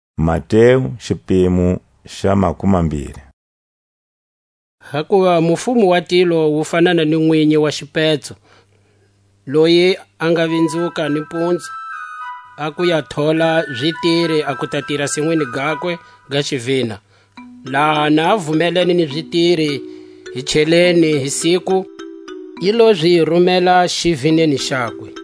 A zitiri za lomu sinwini. Hakuva mufumo wa tilo wu fanana ni nwinyi wa xipetso, loyi a nga vinzuka ni mpunzu a ku ya thola zitiri a ku ta tira sinwini gakwe ga xivina. Laha na vumelene ni zitiri hi cheleni hi siku, i lo zi rumela xivineni xakwe.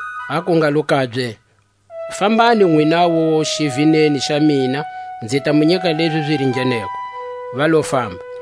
aku ngalo kabye: Fambani nwinawu xivineni xa mina, nzi ta mu nyika lezi zi ringeneko. Va lo famba.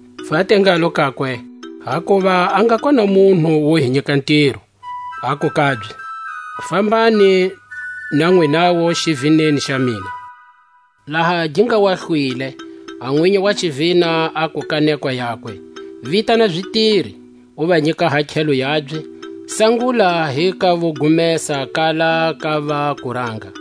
Va te ngalo kakwe: Hakuva a nga kona munhu wo hi nyika ntiro. Aku kabye: Fambani na nwinawu xivineni xa mina. Laha gi nga hlwile, a nwinyi wa xivina aku ka nekwa yakwe: Vitana zitiri, u va nyika hakhelo yabye; sangula hi ka vo gumesa kala ka va kuranga.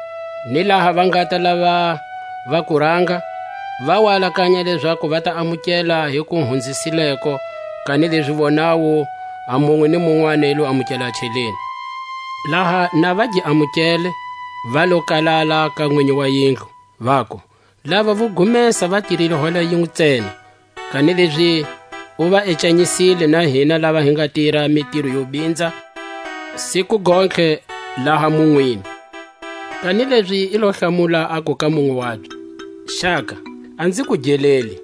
Ni laha va ngata lava va kuranga, va wa alakanya lezaku va ta amukela hi ku hunzisileko; kanilezi vonawu a munwe ni munwani i lo amukela a cheleni. Laha na va gi amukele, va lo kalala ka nwinyi wa yindlu, vaku: Lava vo gumesa va tirile hora yinwe ntsena, kanilezi u va ecanyisile na hina lava hi nga tira mitiro yo binza siku gontlhe laha munwini. Kanilezi i lo hlamula aku ka munwe wabye: Xaka, a nzi ku geleli;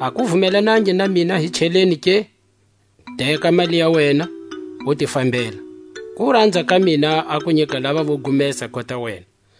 a ku vumelanangi na mina hi cheleni ke? Teka a mali ya wena, u ti fambela; kuranza ka mina a ku nyika lava vo gumesa kota wena.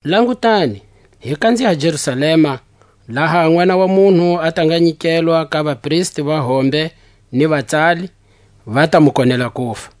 Langutani, hi kanziha Jerusalema, laha a Nʼwana wa munhu a ta nga nyikelwa ka vapristi va hombe ni vatsali; va ta mu konela kufa.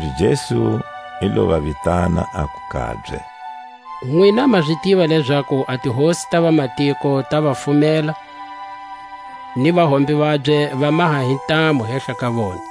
Kanilezi Jesu i lo va vitana, aku kabye: Nwina ma zi tiva lezaku a tihosi ta vamatiko ta va fumela, ni vahombe vabye va maha hi ntamu hehla ka vona.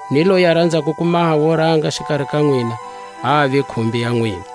Ni loyi a ranzako ku maha wo ranga xikari ka nwina a ave khumbi ya nwina;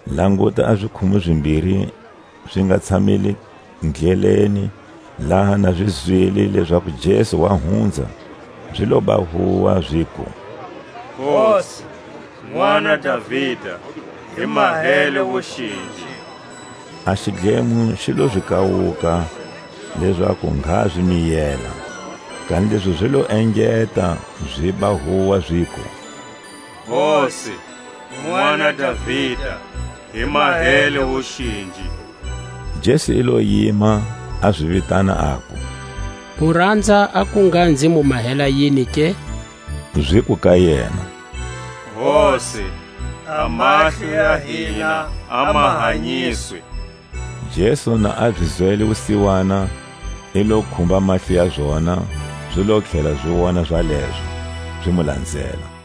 Languta, a zikhumu zimbiri zi nga tshamile ndleleni, laha na zi zwile lezaku Jesu wa hunza, zi loba huwa, ziku: Hosi, nʼwana Davida, hi mahele wuxinji. A xidlemo xi lo zi kawuka, lezaku ngha zi miyela; kanilezi zi lo engeta ziba huwa, ziku: Hosi, nʼwana Davida, hi mahele wuxinji. Jesu i lo yima, a zi vitana, aku: Mu ranza a ku ngha nzi mu mahela yini ke? Ziku ka yena: Hosi, a mahlo ya hina a ma hanyiswa. Jesu na a zi zwele wusiwana, i lo khumba mahlo ya zona; zi lo tlhela zi wona zalezo, zi mu lanzela.